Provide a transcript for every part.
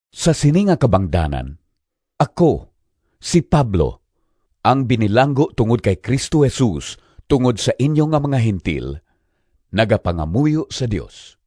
Sa sini nga kabangdanan, ako, si Pablo, ang binilanggo tungod kay Cristo Jesus tungod sa inyo nga mga Gentil, nagapangamuyo sa Dios.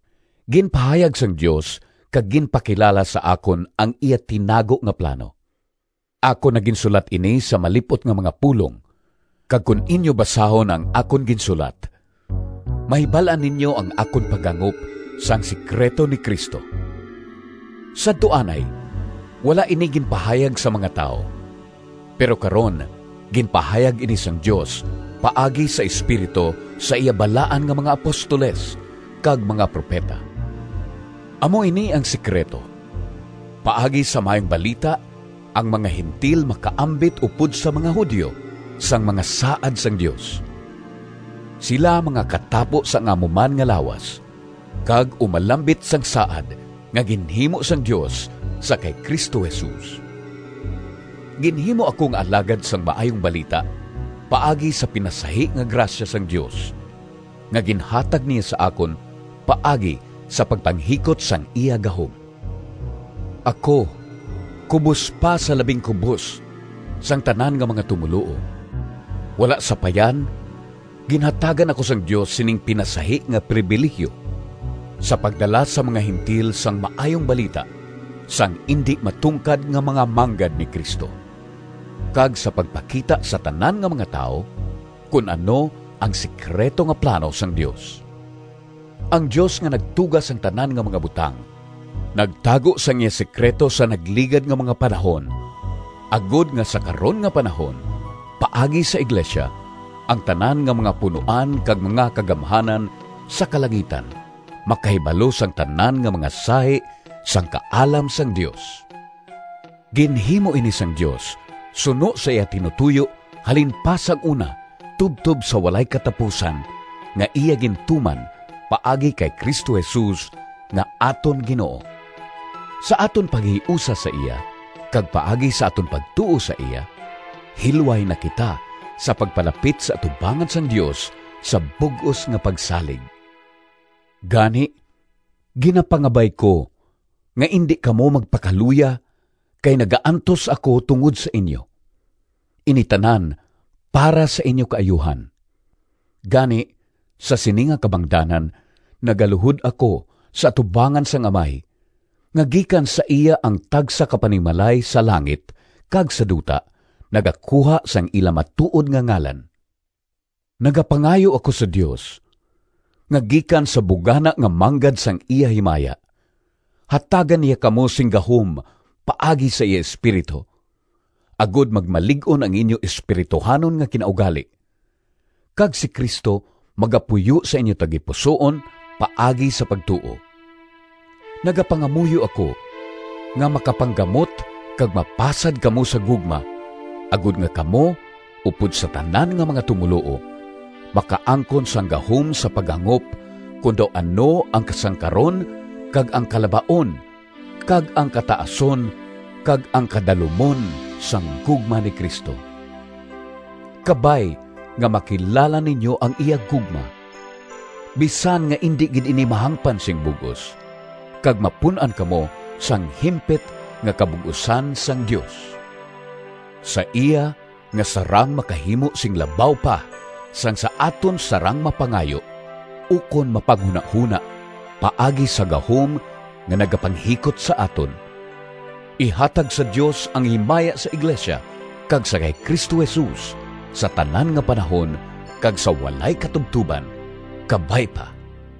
Ginpahayag sang Dios kag ginpakilala sa akon ang iya tinago nga plano. (Akon na ginsulat ini sa malip-ot nga mga pulong, kag kon inyo basahon ang akon ginsulat mahibal-an ninyo ang akon paghangop sang sekrito ni Cristo.) Sadto anay wala ini ginpahayag sa mga tawo, pero karon ginpahayag ini sang Dios paagi sa Espiritu sa iya balaan nga mga apostoles kag mga propeta. Amo ini ang sekrito: paagi sa Maayong Balita ang mga Gentil makaambit upod sa mga Judio sang mga saad sang Dios. Sila mga katapo sang amo man nga lawas, kag umalambit sang saad nga ginhimo sang Dios sa kay Cristo Jesus. Ginhimo ako nga alagad sang Maayong Balita paagi sa pinasahi nga grasya sang Dios, nga ginhatag niya sa akon paagi sa pagpanghikot sang iya gahom. Ako kubos pa sa labing kubos sang tanan nga mga tumoluo, wala sapayan ginhatagan ako sang Dios sining pinasahi nga prebilihiyo sa pagdala sa mga Gentil sang Maayong Balita sang indi matungkad nga mga manggad ni Cristo, kag sa pagpakita sa tanan nga mga tawo kon ano ang sekrito nga plano sang Dios. Ang Dios nga Nagtuga sang tanan nga mga butang, nagtago sang iya sekrito sa nagligad nga mga panahon, agod nga sa karon nga panahon, paagi sa iglesia, ang tanan nga mga punoan kag mga kagamhanan sa kalangitan makahibalo sang tanan nga mga sahi sang kaalam sang Dios. Ginhimo ini sang Dios suno sa iya tinutoyo halin pa sang una tubtob sa walay katapusan nga iya gintuman paagi kay Cristo Jesus nga aton Ginoo. Sa aton paghiusa sa iya kag paagi sa aton pagtuo sa iya, hilway na kita sa pagpalapit sa atubangan sang Dios sa bug-os nga pagsalig. Gani, ginapangabay ko nga indi kamo magpakaluya kay nagaantos ako tungod sa inyo. Ini tanan para sa inyo kaayuhan. Gani, sa sini nga kabangdanan, nagaluhod ako sa atubangan sang Amay, nga gikan sa iya ang tagsa ka panimalay sa langit kag sa duta nagakuha sang ila matuod nga ngalan. Nagapangayo ako sa Dios, nga gikan sa bugana nga manggad sang iya himaya, hatagan niya kamo sing gahom paagi sa iya Espiritu, agod magmalig-on ang inyo espirituhanon nga kinaugali, kag si Cristo magapuyo sa inyo tagipusoon paagi sa pagtuo. Nagapangamuyo ako nga makapanggamot kag mapasad kamo sa gugma, agod nga kamo, upod sa tanan nga mga tumoluo, makaangkon sang gahom sa paghangop kon daw ano ang kasangkaron kag ang kalabaon kag ang kataason kag ang kadalumon sang gugma ni Cristo. Kabay nga makilala ninyo ang iya gugma, bisan nga indi gid ini mahangpan sing bug-os, kag mapun-an kamo sang himpit nga kabug-osan sang Dios. Sa iya nga sarang makahimo sing labaw pa sang sa aton sarang mapangayo, ukon mapanghunahona, paagi sa gahom nga nagapanghikot sa aton: ihatag sa Dios ang himaya sa iglesia kag sa kay Cristo Jesus, sa tanan nga panahon, kag sa walay katubtoban! Kabay pa.